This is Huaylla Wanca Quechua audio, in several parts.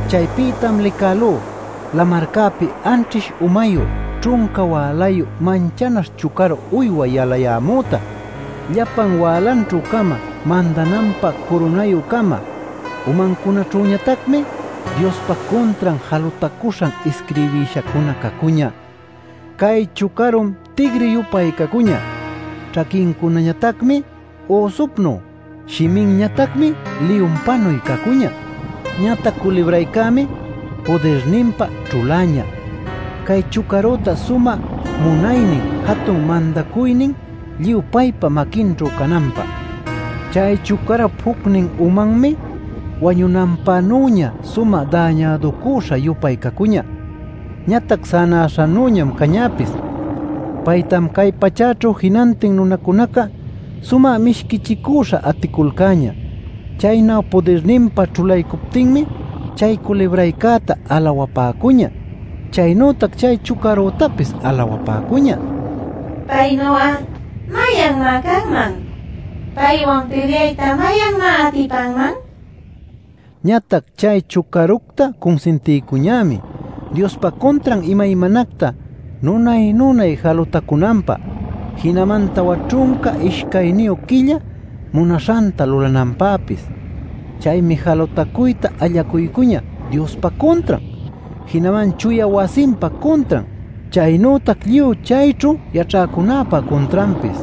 Chaypïtam licälú lamarcäpi anćhish umayu ćhunca wälayu manchanaśh chucaru uywa yalayämüta. Llapan wälanćhü-cama mandananpä curunayü-cama; umancunaćhüñatacmi Diospa cuntran jalutacuśhan isquirbishacuna cacuñä. Cay chucarum tigri-yupay cacuñä; ćhaquincunañatacmi üsupnuy; shiminñatacmi liyunpanuy cacuñä. Ñatac culibraycämi pudirninpa ćhuläñä cay chucarüta sumä munaynin, jatun mandacuynin lluy paypa maquinćhu cananpä. Chay chucarup jucnin umanmi wañunanpänüña sumä dañäducüśha-yupay cacuñä. Ñatac sänäśhanüñam cañäpis. Paytam cay pachäćhu jinantin nunacunaca sumä mishquichicüśha aticulcäñä. Chaynu pudirninpa ćhulaycuptinmi chay culibraycäta alawapäcuñä. Chaynütac chay chucaructapis alawapäcuñä: “¿Paynuy'a mayanmá canman? ¿Paywan pilyayta mayanmá atipanman?” nil. Ñatac chay chucaructa cunsintiycuñämi Diospa cuntran imaymanacta nunay-nunay jalutacunanpä jinaman tawa ćhunca ishcayniyu quilla munaśhanta lulananpäpis. Chaymi jalutacuyta allacuycuñä Diospa cuntran, jinaman chuya wasinpa cuntran, chaynütac lluy chayćhu yaćhäcunäpa cuntranpis.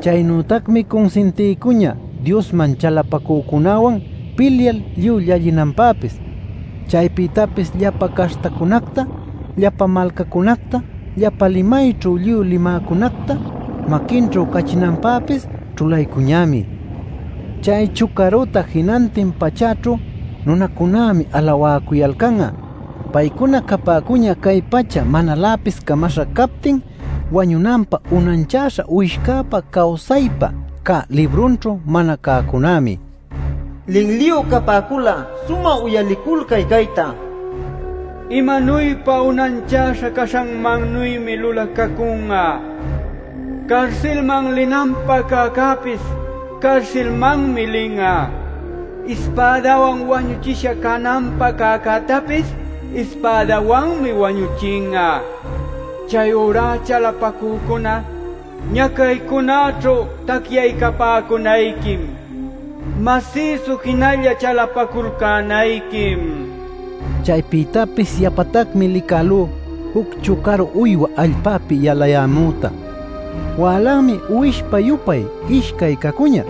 Chaynütacmi cunsintiycuñä Diosman chalapacücunäwan pilyal lluy llallinanpäpis. Chaypïtapis llapa caśhtacunacta, llapa malcacunacta, llapa limayćhu lluy limäcunacta maquinćhu cachinanpäpis ćhulaycuñämi. Chay chucarüta jinantin pachäćhu nunacunämi alawäcuyalcan'a. Paycuna capäcuñä cay pacha manaläpis camaśha captin wañunanpä unanchäśha Uwishcäpa cawsaypä cä librunćhu mana cäcunämi. Linliyu capäcul'a sumä uyaliculcay cayta: Imanuypa unanchäśha caśhanmannümi lulacacun'a: carsilman linanpä cäcäpis carsilmanmi lin'a; ispädawan wañuchisha cananpä cäcätapis ispädawanmi wañuchin'a. Chayurá chalapacücuna, ¡ñacaycunäćhu tacyaycapäcunayquim, masïsu jinalla chalapaculcänayquim! Chaypïtapis yapatacmi licälú juc chucaru uywa allpäpi yalayämüta. Wälanmi uwishpa-yupay ishcay cacuñä;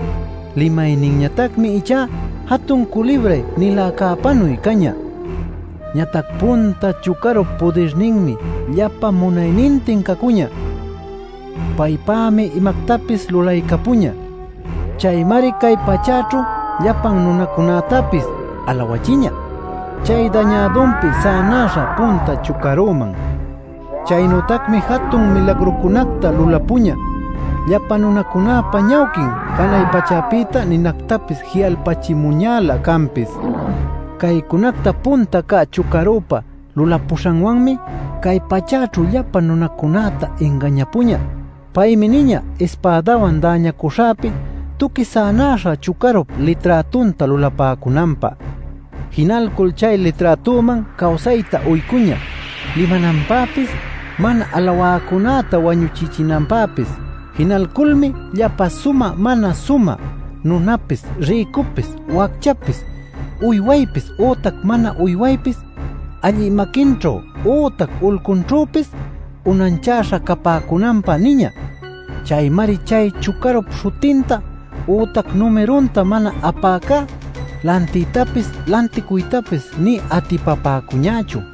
limayninñatacmi ichá jatun culibray-niläcäpanuy cañä. Ñatac punta chucarup pudirninmi llapa munaynintin cacuñä. Paypämi imactapis lulaycapuñä. Chaymari cay pachäćhu llapan nunacunätapis alawächiñä chay dañädunpi sänäśha punta chucaruman. Chaynütacmi jatun milagrucunacta lulapuñä; llapa nunacunäpa ñawquin janay pachäpïta ninactapis ji'alpachimuñälä canpis. Caycunacta punta cä chucarüpä lulapuśhanwanmi cay pachäćhu llapa nunacunäta ingañapuñä. Paymi niñä ispädawan däñacüśhapi tuqui sänaśha chucarup liträtunta lulapäcunanpä. Jinalcul chay liträtuman cawsayta uycuñä limananpäpis mana alawäcunäta wañuchichinanpäpis. Jinalculmi llapa sumä mana sumä nunapis, rïcupis, wacchapis, uywaypis ütac mana uywaypis allï maquinćhu ütac ulcunćhüpis unanchäśha capäcunanpä niñä. Chaymari chay chucarup śhutinta ütac numirunta mana apäcá lantiytapis lanticuytapis nï atipapäcuñächu.